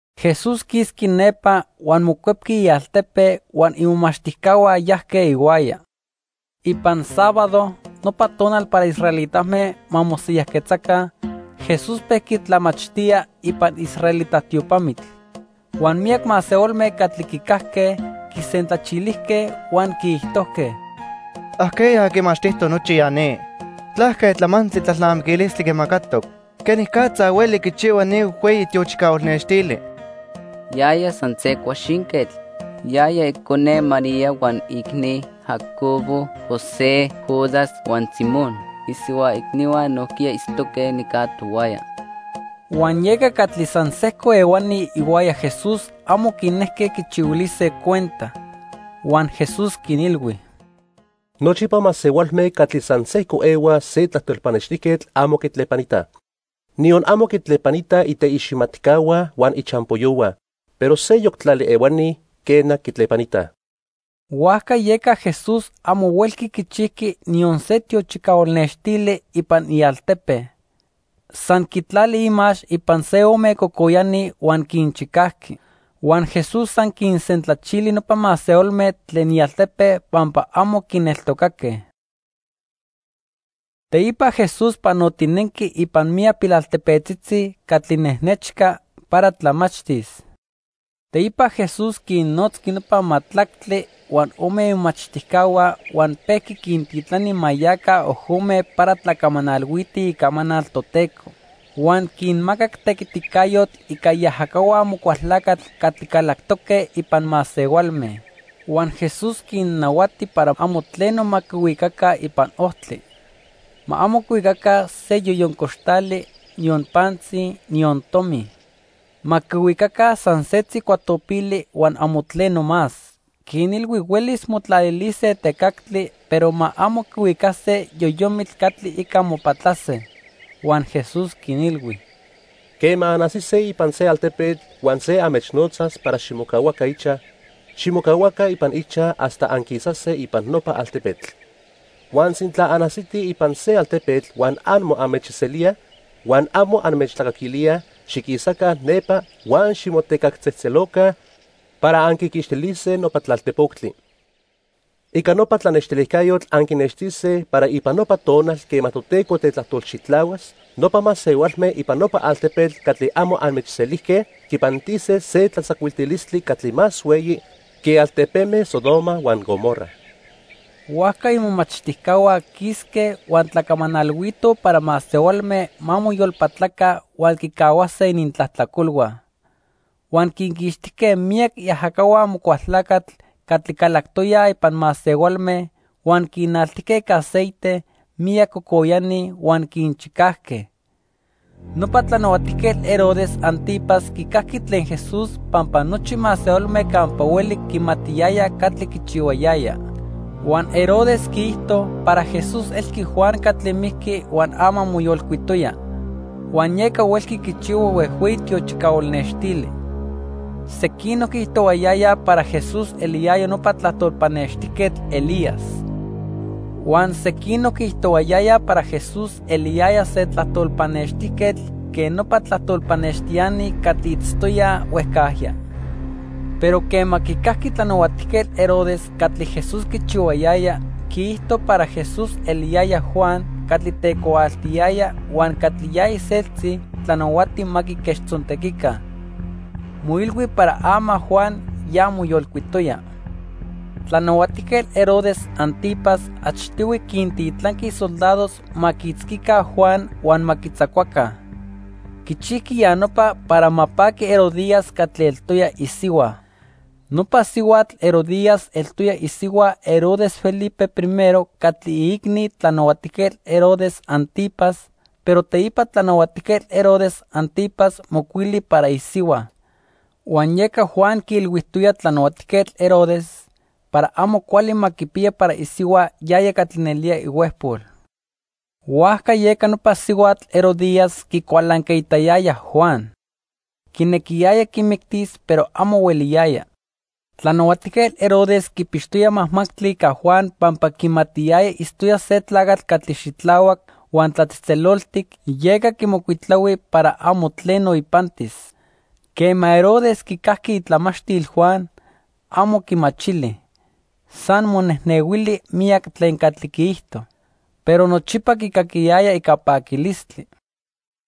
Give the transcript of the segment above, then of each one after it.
Jesús quisqui nepa huan mocuepqui ialtepe huan imomachtijcahua yajque ihuaya. Ipan sábado, nopa tonal para israelitame ma mosiyajquetzaca, Jesús pejqui tlamachtía ipan israelita tiopamitl. Huan miyac masehualme catli quicajque quisentlachilijque huan quiijtojque: —¿Ajqueya quimachtijtoc nochi ya ni? ¿Tlaque tlamantli tlalnamiquilistli quimacatoc? ¿Quenicatza hueli quichihua ni huejhueyi tiochicahual nextili? Yaya san se cuaxinquetl. Yaya icone María huan iicni Jacobo, José, Judas, huan Simón. Isihua icnihua nojquiya itztoque nica tohuaya. Huan yeca catli san sejco ehuani ihuaya Jesús amo quinejque quichihuilise cuenta. Huan Jesús quinilhui: —Nochipa masehualme catli san sejco ehuaj se tlajtol pannextijquetl amo quitlepanitaj. Niyon amo quitlepanitaj iteiximatcahua huan ichampoyohua, pero seyoc tlali ehuani, quena, quitlepanitaj. Huajca yeca Jesús amo huelqui quichijqui niyon se tiochicahual nextili ipan ialtepe. San quitlali imax ipan se ome cocoyani huan quinchicajqui. Huan Jesús san quinsentlachili nopa masehualme tlen ialtepe pampa amo quineltocaque. Teipa Jesús panotinenqui ipan miyac pilaltepetzitzi catli nejnechca para tlamachtis. Teipa Jesús quinnotzqui nopa majtlactli huan ome imomachtijcahua huan pejqui quintitlani ma yaca ojome para tlacamanalhuitij icamanal Toteco. Huan quinmacac tequiticayotl ica iajacahua Amocualtlacatl catli calactoque ipan masehualme. Huan Jesús quinnahuati para amo tleno ma quihuicaca ipan ojtli. Ma amo quihuicaca se yoyon coxtali, niyon pantzi, niyon tomi. Ma quihuicaca san setzi cuatopili huan amo tleno más. Quinilhui huelis motlalilise tecactli, pero ma amo quihuicase yoyomitl catli ica mopatlase. Huan Jesús quinilhui: —Quema anajsise ipan se altepetl huan se anmechnotzas para ximocahuaca ichaj, ximocahuaca ipan ichaj hasta anquisase ipan nopa altepetl. Huan sintla anajsitij ipan se altepetl huan amo anmechselíaj, huan amo anmechtlacaquilíaj; xiquisaca nepa huan ximotecactzejtzeloca para anquiquixtilise nopa tlaltejpoctli. Ica nopa tlanextilijcayotl anquinextise para ipan nopa tonal quema Toteco tetlajtolxitlahuas, nopa masehualme ipan nopa altepetl catli amo anmechselijque quipantise se tlatzacuiltilistli catli más hueyi que altepeme Sodoma huan Gomorra. Huajca imomachtijcahua quisque huan tlacamanalhuitoj para masehualme ma moyolpatlaca huan quicahuase inintlajtlacolhua. Huan quinquixtijque miyac iajacahua Amocualtlacatl catli calactoyaj ipan masehualme, huan quinaltijque ica aceite miyac cocoyani huan quinchicajque. Nopa Tlanahuatijquetl Herodes 'Antipas quicajqui tlen Jesús pampa nochi masehualme campa hueli quimatiyayaj catli quichihuayaya. Huan Herodes quiijto para Jesús elqui Juan catli mijqui huan ama moyolcuitoya, huan yeca huelqui quichihua huejhueyi tiochicahual nextili. Sequinoc quiijtohuayayaj para Jesús eliyaya nopa tlajtol pannextijquetl Elías. Huan sequinoc quiijtohuayayaj para Jesús eliyaya se tlajtol pannextijquetl quen nopa tlajtol pannextiani catli itztoyaj huejcajya. Pero quema quicajqui Tlanahuatijquetl Herodes catli Jesús quichihuayaya, quiijto para Jesús eliyaya Juan catli tecuaaltiyaya huan catli ya iseltzi tlanahuati ma quiquechtzontequica. Moilhui para ama Juan ya moyolcuitoya. Tlanahuatijquetl Herodes 'Antipas achtihui quintitlanqui isoldados ma quiitzquica Juan huan ma quitzacuaca. Quichijqui ya nopa para ma paqui Herodías catli eltoya isihua. Nopa sihuatl Herodías eltoya isihua Herodes Felipe I catli iicni Tlanahuatijquetl Herodes 'Antipas, pero teipa Tlanahuatijquetl Herodes 'Antipas mocuili para isihua. Huan yeca Juan quiilhuijtoya Tlanahuatijquetl Herodes para amo cuali ma quipiya para isihua yaya catli nelía ihuejpol. Huajca yeca nopa sihuatl, Herodías, quicualancaitayaya Juan. Quinequiyaya quimictis, pero amo hueliyaya. Tlanahuatijquetl Herodes quipixtoya majmajtli ica Juan pampa quimatiyaya itztoya se tlacatl catli xitlahuac huan tlatzejtzeloltic, yeca quimocuitlahui para amo tleno ipantis. Quema Herodes quicajqui itlamachtil Juan, amo quimachili. San monejnehuili miyac tlen catli quiijto. Pero nochipa quicaquiyaya ica paquilistli.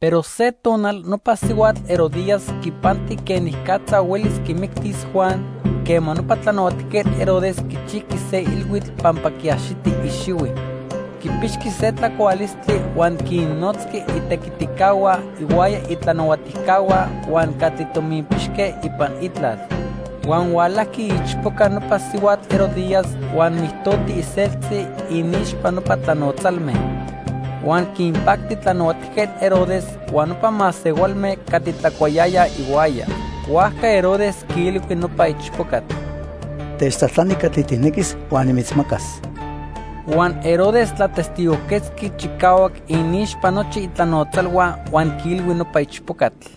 Pero se tonal nopa sihuatl Herodías quipanti quenicatza huelis quimictis Juan quema nopa Tlanahuatijquetl Herodes quichijqui se ilhuitl pampa quiaxiti ixihui. Quipixqui se tlacualistli huan quinnotzqui itequiticahua ihuaya itlanahuatijcahua huan catli tominpixque ipan itlal. Huan hualajqui iichpoca nopa sihuatl Herodías huan mijtoti iseltzi iniixpa nopa tlanotzalme. Huan quinpacti Tlanahuatijquetl Herodes huan nopa masehualme catli tlacuayayaj ihuaya. Huajca Herodes quiilhui nopa ichpocatl: —Techtlajtlani catli tijnequis huan nimitzmacas. Huan Herodes tlatestigojquetzqui chicahuac iniixpa nochi itlanotzalhua huan quiilhui nopa ichpocatl: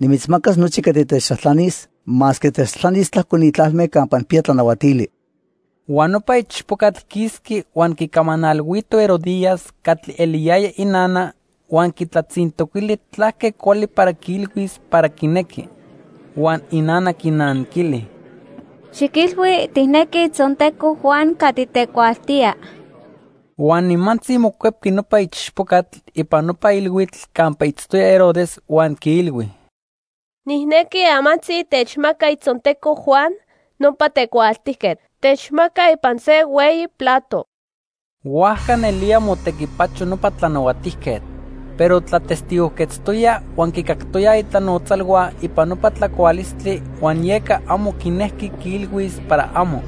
—Nimitzmacas nochi catli techtlajtlanis masque techtlajtlanis tlajco ni tlalme campa nijpiya tlanahuatili. Huan nopa ichpocatl quisqui huan quicamanalhuito Herodías, catli eliyaya inana huan quitlatzintoquili tlaque cuali para quiilhuis para quinequi. Huan inana quinanquili: —Xiquilhui tijnequi itzonteco Juan catli tecuaaltía. Huan nimantzi mocuepqui nopa ichpocatl ipan nopa ilhuitl campa itztoya Herodes huan quiilhui: —Nijnequi amantzi techmaca itzonteco Juan, nopa tecuaaltijquetl. Techmaca ipan se hueyi plato. Huajca nelía motequipacho nopa tlanahuatijquetl. Pero tlatestigojquetztoya huan quicactoyaj itlanotzalhua ipan nopa tlacualistli huan yeca amo quinejqui quiilhuis para amo.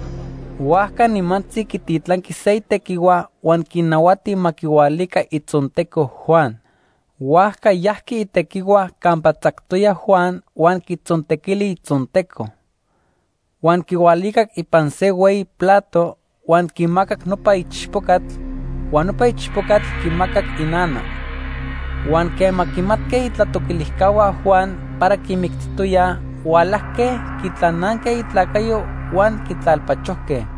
Huajca nimantzi quititlanqui se itequihua huan quinahuati ma quihualica itzonteco Juan. Huajca yajqui itequihua campa tzactoya Juan huan quitzontequili itzonteco. Huan quihualicac ipan se hueyi plato, huan quimacac nopa ichpocatl, huan nopa ichpocatl quimacac inana. Huan quema quimatque itlatoquilijcahua Juan para quimictijtoyaj, hualajque quitlananque itlacayo huan quitlalpachojque.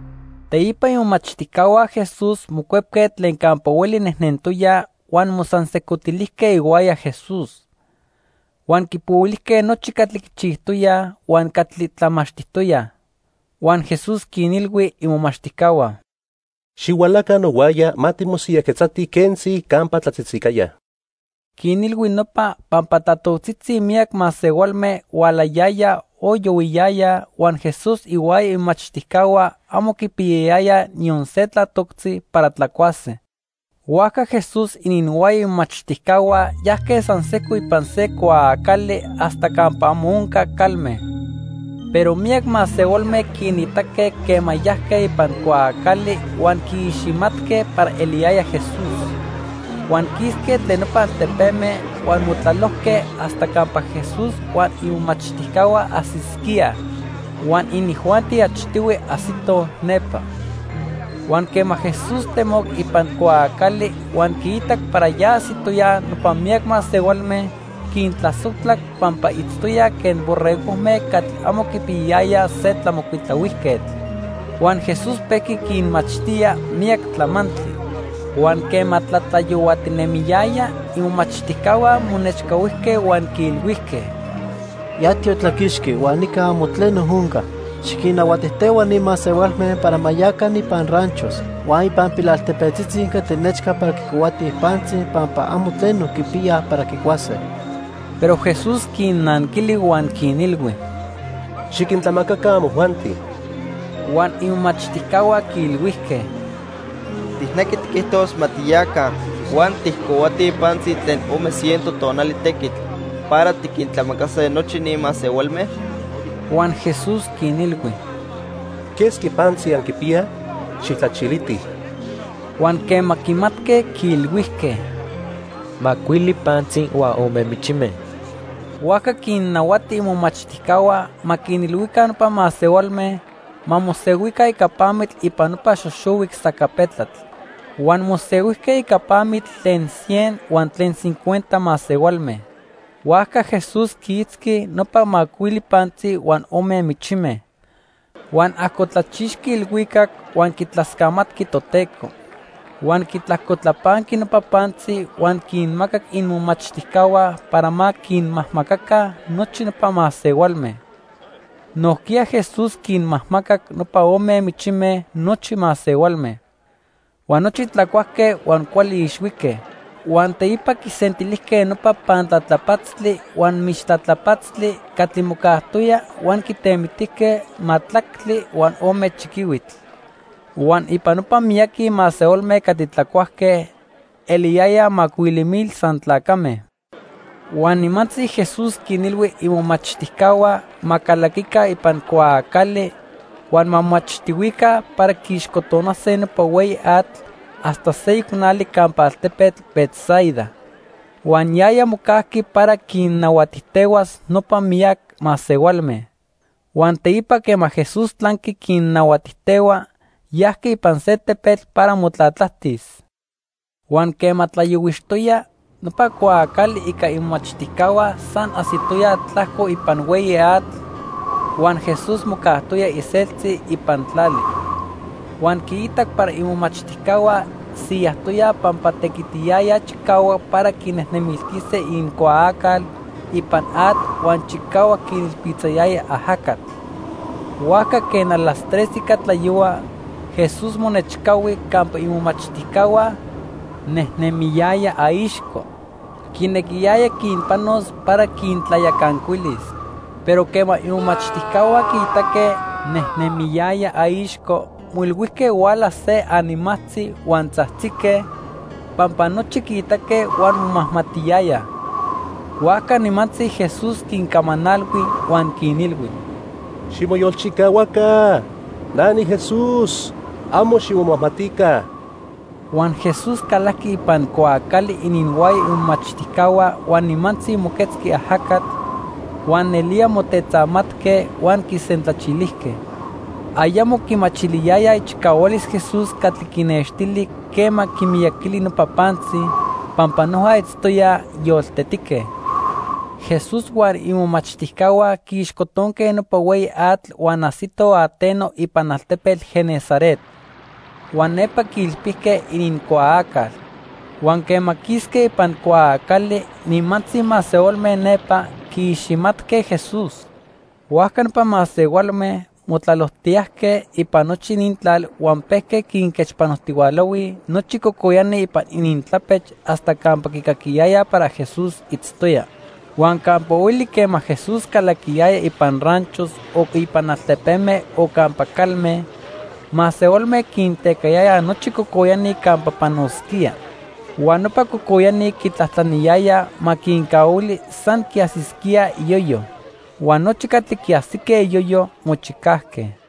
Teipa imomachtijcahua Jesús mocuepque tlen campa hueli nejnentoyaj huan mosansejcotilijque ihuaya Jesús. Huan quipohuilijque nochi catli quichijtoyaj huan catli tlamachtijtoyaj. Huan Jesús quinilhui imomachtijcahua: —Xihualaca nohuaya ma timosiyajquetzatij quentzi campa tlatzitzicaya. Quinilhui nopa pampa tlatoctzitzi miyac masehualme hualayayaj o yohuiyayaj, huan Jesús ihuaya imomachtijcahua amo quipiyayayaj niyon se tlatoctzi para tlacuase. Huajca Jesús ininhuaya imomachtijcahua yajque san sejco ipan se cuaacali hasta campa amo onca calme. Pero miyac masehualme quinitaque quema yajque ipan cuaacali huan quiiximatque para eliyaya Jesús. Huan quisque tlen nopa altepeme huan motlalojque hasta campa Jesús huan imomachtijcahua ajsisquíaj, huan inijuanti achtihui ajsitoj nepa. Huan quema Jesús temoc ipan cuaacali huan quiitac para ya ajsitoyaj nopa miyac masehualme, quintlasojtlac pampa itztoyaj quen borregojme catli amo quipiyayayaj se tlamocuitlahuijquetl. Huan Jesús pejqui quinmachtía miyac tlamantli. Huan quema tlatlayohuatinemiyaya, imomachtijcahua monechcahuijque huan quiilhuijque: —Ya tiotlaquixqui huan nica amo tleno onca. Xiquinnahuatijtehua ni masehualme para ma yaca ipan ranchos huan ipan pilaltepetzitzi catli nechca para quicohuatij pantzi pampa amo tleno quipiyaj para quicuase. Pero Jesús quinnanquili huan quinilhui: —Xiquintlamacaca amojuanti. Huan imomachtijcahua quiilhuijque: —¿Tijnequi tiquijtos ma tiyaca huan tijcohuatij pantzi tlen ome ciento tonali tequitl para tiquintlamacase nochi ni masehualme? Huan Jesús quinilhui: —¿Quesqui pantzi anquipiyaj? Xijtlachilitij. Huan quema quimatque, quiilhuijque: —Macuili pantzi huan ome michime. Huajca quinnahuati imomachtijcahua ma quinilhuica nopa masehualme ma mosehuica ica pamitl ipan nopa xoxohuic sacapetlatl. Huan mosehuijque ica pamitl tlen cien huan tlen cincuenta masehualme. Huajca Jesús quiitzqui nopa macuili pantzi huan ome michime. Huan ajcotlachixqui ilhuicac huan quitlascamatqui Toteco. Huan quitlajcotlapanqui nopa pantzi huan quinmacac imomachtijcahua para ma quinmajmacaca nochi nopa masehualme. Nojquiya Jesús quinmajmacac nopa ome michime nochi masehualme. Huan nochi tlacuajque huan cuali ixhuique. Huan teipa quisentilijque nopa pantlatlapatztli huan michtlatlapatztli catli mocajtoya huan quitemitijque majtlactli huan ome chiquihuitl. Huan ipan nopa miyaqui masehualme catli tlacuajque, eliyayaj macuili mil san tlacame. Huan nimantzi Jesús quinilhui imomachtijcahua ma calaquica ipan cuaacali huan ma moachtihuica para quiixcotonase nopa hueyi atl hasta seyoc nali campa altepetl Betsaida. Huan yaya mocajqui para quinnahuatijtehuas nopa miyac masehualme. Huan teipa quema Jesús tlanqui quinnahuatijtehua, yajqui ipan se tepetl para motlatlajtis. Huan quema tlayohuixtoya, nopa cuaacali ica imomachtijcahua san ajsitoya tlajco ipan hueyi atl, huan Jesús mocajtoya iseltzi ipan tlali. Huan quiitac para imomachtijcahua siyajtoyaj pampa tequitiyayaj chicahuac para quinejnemiltise inincuaacal ipan atl huan chicahuac quinilpitzayaya ajacatl. Huajca quen las tres ica tlayohua, Jesús monechcahui campa imomachtijcahua, nejnemiyaya aixco. Quinequiyaya quinpanos para quintlayacancuilis. Pero quema imomachtijcahua quiitaque nejnemiyaya aixco, moilhuijque huala se animajtzi huan tzajtzique, pampa nochi quiitaque huan momajmatiyayaj. Huajca nimantzi Jesús quincamanalhui huan quinilhui: —Ximoyolchicahuaca. Na niJesús. Amo ximomajmatica. Huan Jesús calajqui ipan cuaacali ininhuaya imomachtijcahua huan nimantzi moquetzqui ajacatl, huan nelía motetzamatque huan quisentlachilijque. Ayamo quimachiliyayaj ichicahualis Jesús catli quinnextili quema quimiyaquili nopa pantzi, pampa noja itztoyaj yoltetique. Jesús huan imomachtijcahua quiixcotonque nopa hueyi atl huan ajsitoj ateno ipan altepetl Genesaret. Huan nepa quiilpijque inincuaacal. Huan quema quisque ipan cuaacali, nimantzi masehualme nepa quiiximatque Jesús. Huajca nopa masehualme motlalojtiyajque ipan nochi inintlal huan pejque quinquechpanojtihualahuij nochi cocoyani ipan inintlapech hasta campa quicaquiyaya para Jesús itztoya. Huan campa hueli quema Jesús calaquiyaya ipan ranchos o ipan altepeme o campa calme, masehualme quintecayayaj nochi cocoyani campa panosquía. Huan nopa cocoyani quitlajtlaniyayaj ma quincahuili san quiajsisquíaj iyoyo. Huan nochi catli quiajsique iyoyo, mochicajque.